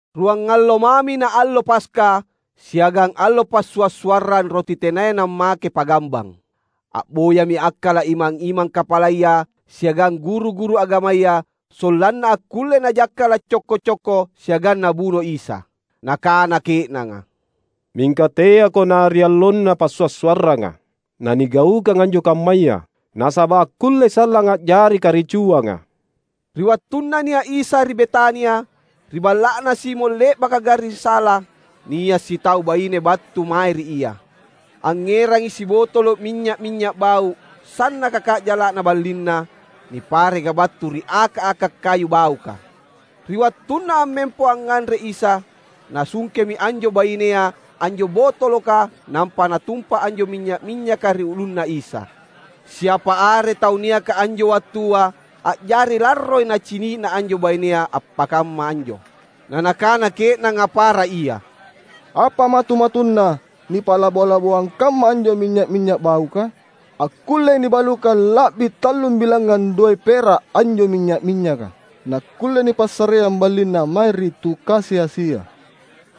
Ruangallo mami na allo Paska siagang allo Passua’-suarrang Roti Tenaya Nammake Pa’gambang. A’boyami akkala’ imang-imang kapalaya siagang guru-guru agamaya sollanna akkulle najakkala’ cokko-cokko siagang nabuno Isa. Nakana ke’nanga, "Mingka teako na ri allonna passua’-suarranga, nanigaukang anjo kammaya, nasaba’ akkullei sallang a’jari karicuanga." Ri wattunna nia’ Isa ri Betania, ri balla’na Simon le’baka garring sala, nia’ sitau baine battu mae ri Ia. Angngerangi sibotolo’ minynya’-minynya’ bau’, sannaka ka’jala’na ballinna nipareka battu ri aka’-aka’ kayu bauka. Ri wattunna ammempo angnganre Isa nasungkemi anjo bainea anjo botoloka nampa natumpa anjo minynya’-minynyaka ri ulunNa Isa. Siapa are tau niaka anjo wattua a’jari larroi nacini’na anjo bainea appakamma anjo. Na nakana ke’nanga para ia, "Apa matu-matunna nipa’labo-laboang kamma anjo minynya’-minynya’ bauka? Akkullei nibalukang la’bi tallum bilangngang doe’ pera’ anjo minynya’-minynyaka. Nakkulle nipassareang ballinna mae ri tu kasi-asia!"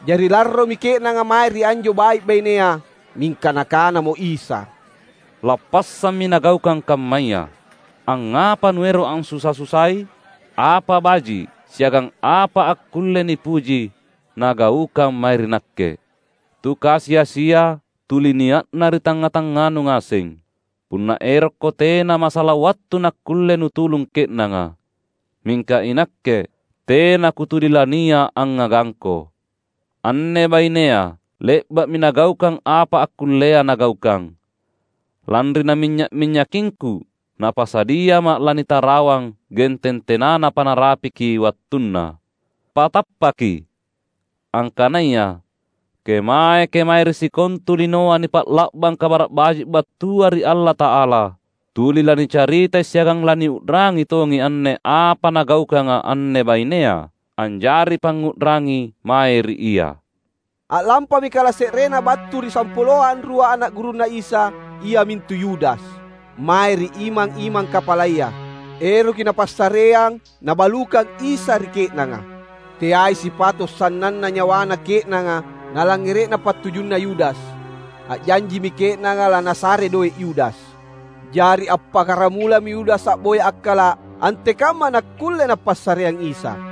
Jari larromi ke’nanga mae ri anjo bai’-bainea. Mingka Nakanamo Isa, "Lappassammi nagaukang kammaya! Angngapa nuero’ ansusa-susai? Apa baji’ siagang apa akkulle nipuji nagaukang mae ri Nakke. Tu kasi-asia tuli nia’na ri tangnga-tangnganu ngaseng. Punna erokko tena masala wattu nakkulle nutulung ke’nanga. Mingka iNakke, tena Kutuli lania’ angngagangko. Anne bainea le’ba’mi nagaukang apa akkullea nagaukang. Lanri naminynya’-minynyakingKu, napasadiaMa’ lanitarawang genteng tenanapa narapiki wattunna. Patappaki! Angkanaya, kemae-kemae ri sikontu linoa nipa’la’bang Kabara’ Baji’ battua ri Allata’ala, tuli lanicaritai siagang laniu’rangi tongi anne apa nagaukanga anne bainea, anjari pangngu’rangi mae ri ia." A’lampami kalase’renna battu ri sampuloa anrua ana’ gurunNa Isa, iamintu Yudas, mae ri imang-imang kapalaya. Eroki napassareang nabalukang Isa ri ke’nanga. Teai sipato’ sannanna nyawana ke’nanga nalangngere’na pattujunna Yudas. A’janjimi ke’nanga lanasare doe’ Yudas. Jari appakkaramulami Yudas a’boya akkala’ antekamma nakkulle napassareang Isa.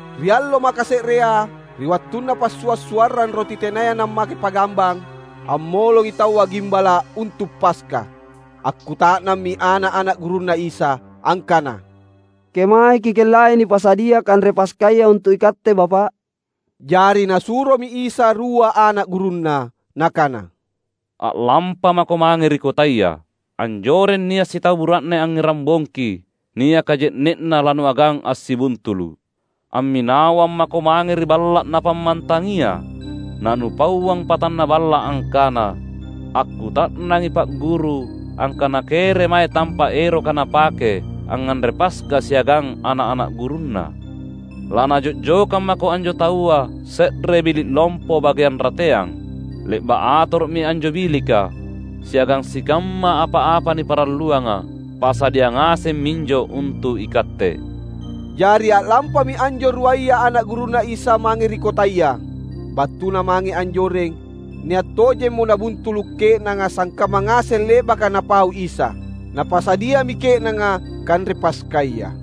Ri allo makase’rea, ri wattunna Passua’-suarrang Roti Tenaya Nammake Pa’gambang, ammolongi taua gimbala’ untu’ Paska. Akkuta’nammi ana’-ana’ gurunNa Isa angkana, "Kemae Kikellai nipasadia kanre Paskaya untu’ iKatte Bapa’?" Jari Nasuromi Isa rua ana’ gurunNa Nakana, "A’lampa mako mange ri kotaya. Anjoreng nia’ sitau bura’ne angngerang bongki niaka je’ne’na lanuagang assibuntulu’. Amminawang mako mange ri balla’ napammantangia, na nupauang patanna balla’ angkana, ‘Akkuta’nangi Pa’ Guru angkana keremae tampa’ eroka Napake angnganre Paska siagang ana’-ana’ gurunNa.’ Lanajo’jokang mako anjo taua se’re bili’ lompo bageang rateang. Le’ba’ atoro’mi anjo bilika, siagang sikamma apa-apa niparalluanga. Pasadia ngaseng minjo untu’ ikatte." Jari a’lampami anjo ruaya ana’ gurunNa Isa mange ri kotaya. Battuna mange anjoreng nia’ tojemmo nabuntulu’ ke’nanga sangkamma ngaseng le’baka Napau Isa. Napasadiami ke’nanga kanre Paskaya.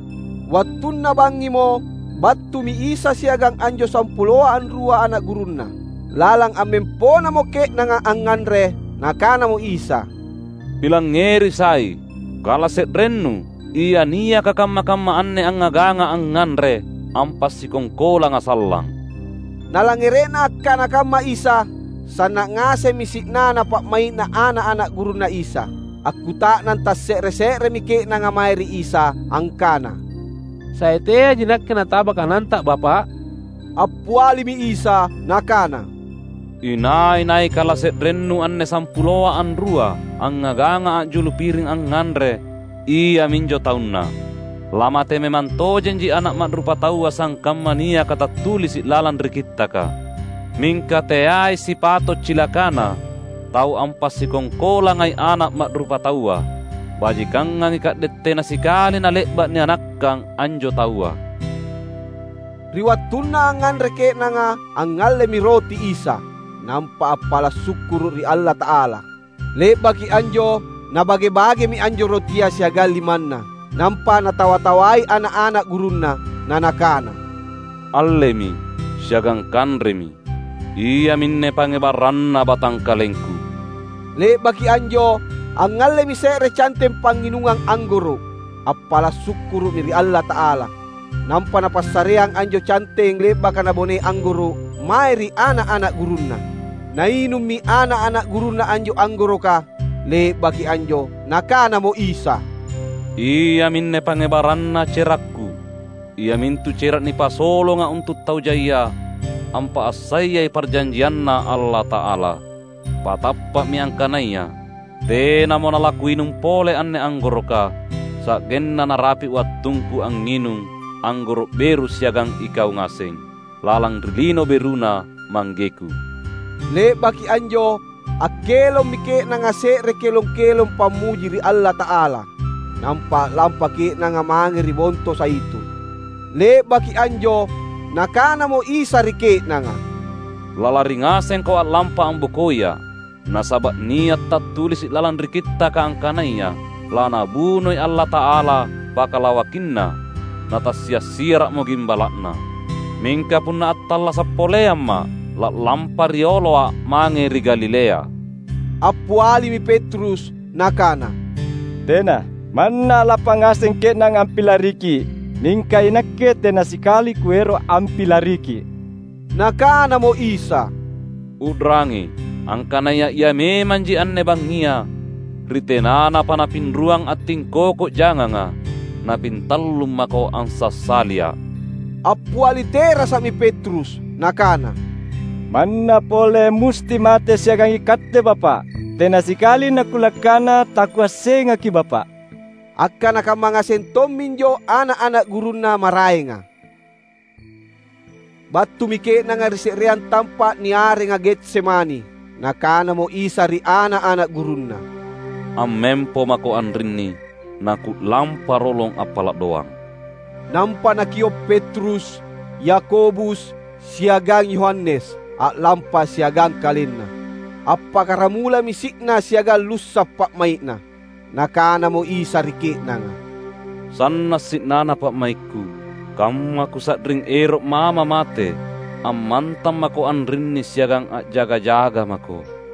Wattunna bangngimo, battumi Isa siagang anjo sampuloa anrua ana’ gurunNa. Lalang ammemponamo ke’nanga angnganre, Nakanamo Isa, "Pilangngeri sai: kala se’rennu, ia niaka kamma-kamma anne angngagangA’ angnganre, ampasikongkolangA’ sallang." Nalangngere’na akkana kamma Isa, sanna’ ngasemmi si’nana pa’mai’na ana’-ana’ gurunNa Isa. Akkuta’nang tasse’re-se’remi ke’nanga mae ri Isa angkana, "Sai teaiji nakke nataba kananTa Bapa’?" Appialimi Isa Nakana, "Inai-nai kalase’rennu anne sampuloa anrua angngagangA’ a’julu piring angnganre iaminjo taunna. Lamate memang tojenji Ana’ Ma’rupataua sangkamma niaka tattulisi’ lalang ri Kittaka. Mingka teai sipato’ cilakana tau ampasikongkolangai Ana’ Ma’rupataua! Bajikangangi ka’de’ tena sikali nale’ba’ nianakkang anjo taua!" Ri wattunna angnganre ke’nanga, angngallemi roti Isa, nampa appala’ sukkuru’ ri Allata’ala. Le’baki anjo Nabage-bagemi anjo rotia siagang limanNa, nampa Natawa-tawai ana’-ana’ gurunNa, na Nakana, "Allemi, siagang kanremi, iaminne pangngebarranna batangkalengKu." Le’baki anjo angngallemi se’re canteng pangnginungang anggoro’. Appala’ sukkuru’mi ri Allata’ala, nampa Napassareang anjo canteng le’baka nabonei anggoro’ mae ri ana’-ana’ gurunNa. Nainummi ana’-ana’ gurunNa anjo anggoroka. Le’baki anjo Nakanamo Isa, "Iaminne pangngebarranna cerakKu, iamintu cera’ nipasolonga untu’ tau jaia, ampa’assayai parjanjianNa Allata’ala. Patappa’mi angkanaya: Tenamo nalaKuinung pole anne anggoroka, sa’genna narapi’ wattungKu angnginung anggoro’ beru siagang ikau ngaseng, lalang ri Lino BeruNa ManggeKu." Le’baki anjo akkelommi ke’nanga se’re kelong-kelong pammuji ri Allata’ala. Nampa a’lampa ke’nanga mange ri Bonto Zaitun. Le’baki anjo Nakanamo Isa ri ke’nanga, "Lalari ngasengko a’lampa ambokoiA’. Nasaba’ nia’ tattulisi’ lalang ri Kittaka angkanaya, ‘LaNabunoi Allata’ala pakalawakinna, na tassia’-siara’mo gimbala’na.’ Mingka punna attallasa’ poleamMa’, la’lampa rioloA’ mange ri Galilea." Appialimi Petrus nakana, "Tena! Manna a’lampa ngaseng ke’nanga ampilariKi’, mingka inakke tena sikali kuero’ ampilariKi’." Nakanamo Isa, "U’rangi, angkanaya ia memanji anne bangngia, ri tenanapa napinruang attingkoko janganga, napintallung mako ansassaliA’." Appiali terasa’mi Petrus nakana, "Manna pole musti matea’ siagang iKatte Bapa’, tena sikali nakulangkana takuassengaKi’ Bapa’!" Akkana kamma ngaseng tomminjo ana’-ana’ gurunNa maraenga. Battumi ke’nanga ri se’reang tampa’ niarenga Getsemani. Nakanamo Isa ri ana’-ana’ gurunNa, "Ammempo mako anrinni naKu’lampa rolong appala’ doang." Nampa Nakio’ Petrus, Yakobus siagang Yohanes a’lampa siagang KalenNa. Appakkaramulami si’na siagang lussa’ pa’mai’Na. Nakanamo Isa ri ke’nanga, "Sanna’ si’nana pa’maikKu, kamma Kusa’ring ero’maMa’ mate. Ammantang mako anrinni siagang a’jaga-jaga mako!"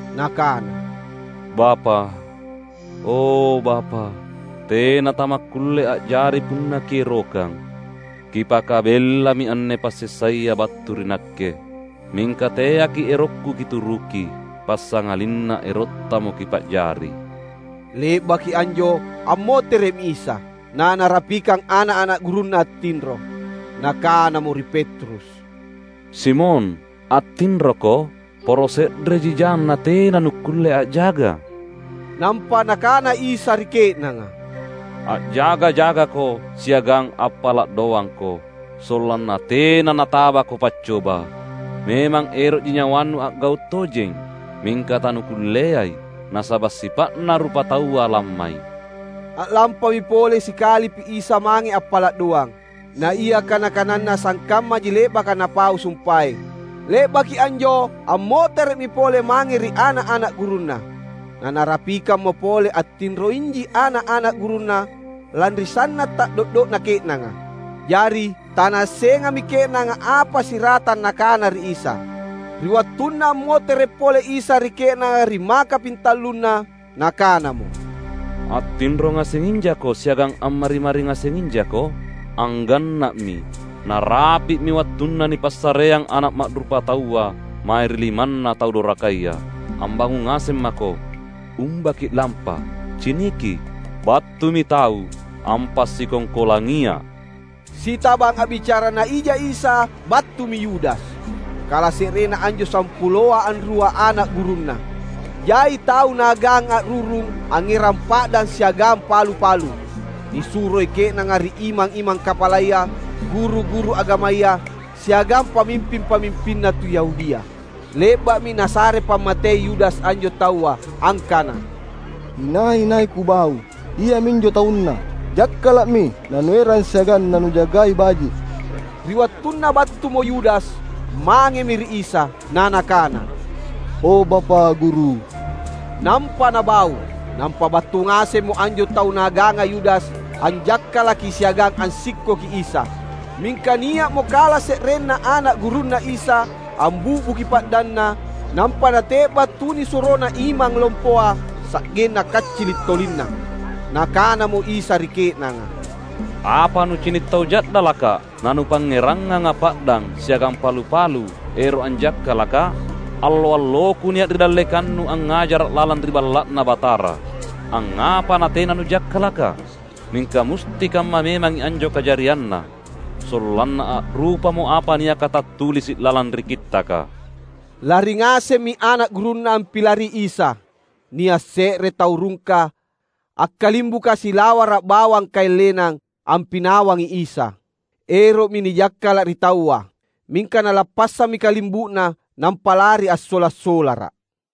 Nakana, "Bapa’, o Bapa’, tena tamakkulle a’jari punna Kierokang. Kipakabellami anne passessaya battu ri Nakke. Mingka teaKi’ erokKu Kituruki, passangalinna erotTamo Kipa’jari." Le’baki anjo ammotere’mi Isa, na Narapikang ana’-ana’ gurunNa attinro. Nakanamo ri Petrus, "Simon attinroko? Poro se’reji jang natena nukkulle a’jaga?" Nampa Nakana Isa ri ke’nanga, "A’jaga-jagako siagang appala’ doangko sollanna tena natabako paccoba. Memang ero’ji nyawanu a’gau’ tojeng, mingka tanukulleai nasaba’ sipa’na rupataua lammai." A’lampami pole sikalipi Isa mange appala’ doang. Na ia kana-kananNa sangkammaji le’baka Napau sumpaeng. Le’baki anjo ammotere’mi pole mange ri ana’-ana’ gurunNa. Na Narapikammo pole attinroiji ana’-ana’ gurunNa lanri sanna’ ta’do’do’na ke’nanga. Jari tanaassengami ke’nanga apa siratang nakana ri Isa. Ri wattunna ammotere’ pole Isa ri ke’nanga ri makapintallunna, Nakanamo, "Attinro ngasenginjako siagang ammari-mari ngasenginjako? Angganna’mi! Narapi’mi wattunna nipassareang Ana’ Ma’rupataua mae ri limanna tau dorakaya. Ambangung ngaseng mako, umba ki’lampa. Ciniki: Battumi tau ampasikongkolangiA’!" Sitabang a’bicarana ija Isa battumi Yudas, kalase’renna anjo sampuloa anrua ana’ gurunNa. Jai tau naagang a’rurung, angngerang pa’dang siagang palu-palu. Nisuroi ke’nanga ri imang-imang kapalaya, guru-guru agamaya, siagang pamimping-pamimpinna tu Yahudia. Le’ba’mi nasare pammatei Yudas anjo taua angkana, "Inai-nai kubau, iaminjo taunNa. Jakkala’mi nanuerang siagang nanujagai baji’." Ri wattunna battumo Yudas, mangemi ri Isa na nakana, "O Bapa’ Guru!" nampa nabau. Nampa battu ngasemmo anjo tau naaganga Yudas anjakkalaki siagang ansikkoki Isa. Mingka nia’mo kalase’renna ana’ gurunNa Isa ambi’buki pa’danna nampa nate’ba’ tunisurona imang lompoa, sa’genna kaccili’ tolinna. Nakanamo Isa ri ke’nanga, "Apa nucini’ tau ja’dalakKa’ na nupangngerangngangA’ pa’dang siagang palu-palu ero’ anjakkalakKa’? Allo-alloKu nia’ ri dallekannu angngajara’ lalang ri Balla’Na Batara, angngapa natena nujakkalakKa’? Mingka musti kamma memangi anjo kajarianna, sollanna a’rupamo apa niaka tattulisi’ lalang ri Kittaka." Lari ngasemmi ana’ gurunNa ampilari Isa. Nia’ se’re tau rungka, akkalimbuka silawara’ bawang kaeng lenang, ampinawangi Isa. Ero’mi nijakkala’ ri taua, mingka nalappassammi kalimbu’na, nampa lari assola’-solara.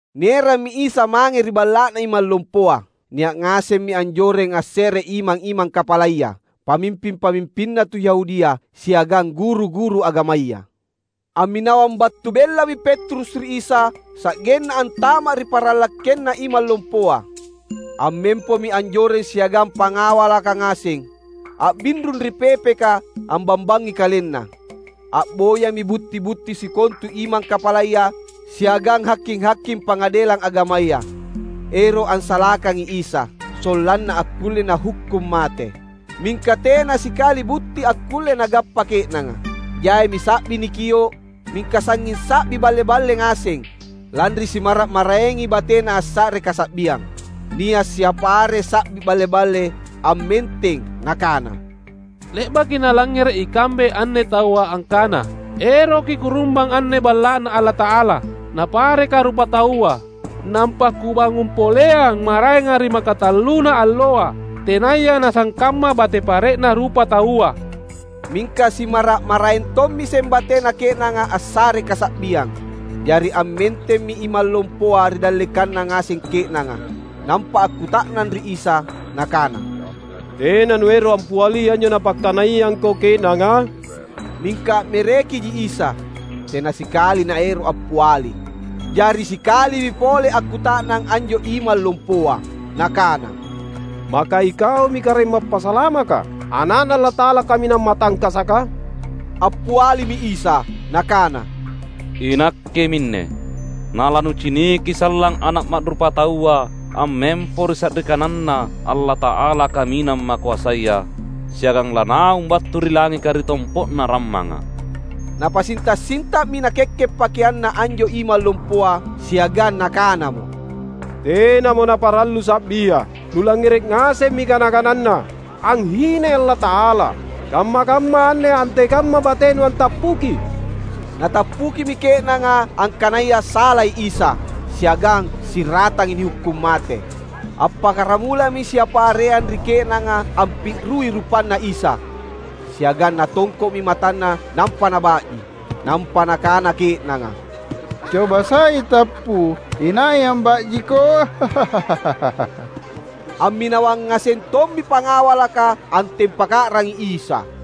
Nierammi Isa mange ri balla’na imang lompoa. Nia’ ngasemmi anjoreng asse’re imang-imang kapalaya, pamimping-pamimpinna tu Yahudia, siagang guru-guru agamaya. Amminawang battu bellami Petrus ri Isa sa’genna antama’ ri paranglakkenna imang lompoa. Ammempomi anjoreng siagang pangawalaka ngaseng, a’binrung ri pepeka ambambangi kalenna. A’boyami butti-butti sikontu imang kapalaya siagang haking-haking Pangadelang Agamaya, ero’ ansalakangi Isa, sollanna akkulle nahukkung mate. Mingka tena sikali butti akkulle nagappa ke’nanga. Jaimi sa’bi nikio’, mingka sangnging sa’bi balle-balle ngaseng, lanri simmara’-maraengi batena assare kasa’biang. Nia’ siapa are sa’bi balle-balle ammenteng nakana, "Le’baki nalangngere’ ikambe anne taua angkana, ‘Eroki Kurumbang anne Balla’Na Allata’ala, napareka rupataua, nampa Kubangung poleang maraenga ri makatalluna alloa, tenaya nasangkamma bate pare’na rupataua.’" Mingka simmara’-maraeng tommiseng batena ke’nanga assare kasa’biang. Jari ammentemmi imang lompoa ri dallekanna ngaseng ke’nanga, nampa akkuta’nang ri Isa nakana, "Tena Nuero’ ampiali anjo napakkanaiangKo ke’nanga?" Mingka a’merekiji Isa. Tena sikali Naero’ appiali. Jari sikalipi pole akkuta’nang anjo imang lompoa nakana, "Maka iKaumi Karaeng Mappasalamaka, Ana’Na Allata’ala Kaminang Matangkasaka?" Appialimi Isa Nakana, "INakke minne, na lanuciniki sallang Ana’ Ma’rupataua ammempo ri sa’ri kananNa Allata’ala Kaminang Makoasaya, siagang lanaung battu ri langika ri tompo’na rammanga!" Napasinta’-sinta’mi nakekke’ pakeanna anjo imang lompoa siagang nakanamo, "Tenamo naparallu sa’bia! Nulangngere’ ngasemmi kana-kananNa, anghinai Allata’ala. Kamma-kamma anne antekamma batenu antappuki?" Natappukimi ke’nanga angkanaya salai Isa, siagang siratangi nihukkung mate. Appakkaramulami siapa areang ri ke’nanga ampi’rui rupanNa Isa. Siagang natongko’mi matanNa nampa naba’ji. Nampa nakana ke’nanga, "Coba sai tappu, inai amba’jiKo?" Amminawang ngaseng tommi pangawalaka antempaka’rangi Isa.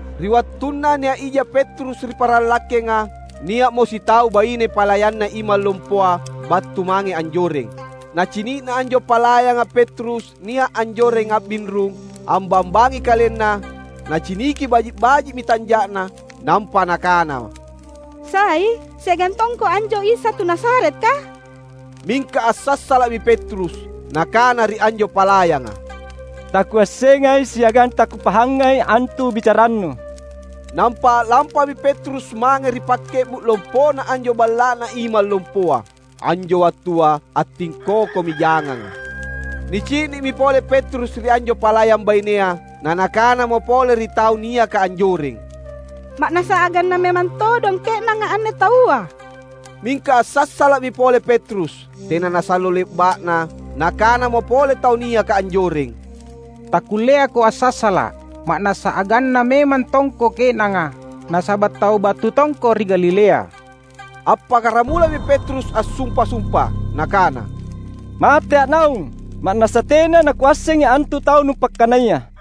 Ri wattunna nia’ ija Petrus ri paranglakkenga, nia’mo sitau baine palayanna imang lompoa battu mange anjoreng. Nacini’na anjo palayanga Petrus nia’ anjoreng a’binrung ambambangi kalenna, naciniki baji’-baji’mi tanja’na. Nampa nakana, "Sai siagang tongko anjo Isa tu Nazaretka?" Mingka assassala’mi Petrus. Nakana ri anjo palayanga, "Takuassengai siagang takupahangai antu bicarannu." Nampa a’lampami Petrus mange ri pakke’bu’ lompona anjo balla’na imang lompoa. [Anjo wattua attingkokomi janganga.] Nicini’mi pole Petrus ri anjo palayang bainea. Na nakanamo pole ri tau niaka anjoreng, "Ma’nassa aganna memang todong ke’nanga anne taua!" Mingka assassala’mi pole Petrus. Tena nasallo le’ba’na, nakanamo pole tau niaka anjoreng, "Takkulleako assassala’, ma’nassa aganna memang tongko ke’nanga; nasaba’ tau battu tongko ri Galilea!" Appakkaramulami Petrus assumpa-sumpa nakana, "Matea’ naung, ma’nassa tena nakuassengi antu tau nupakkanaya!"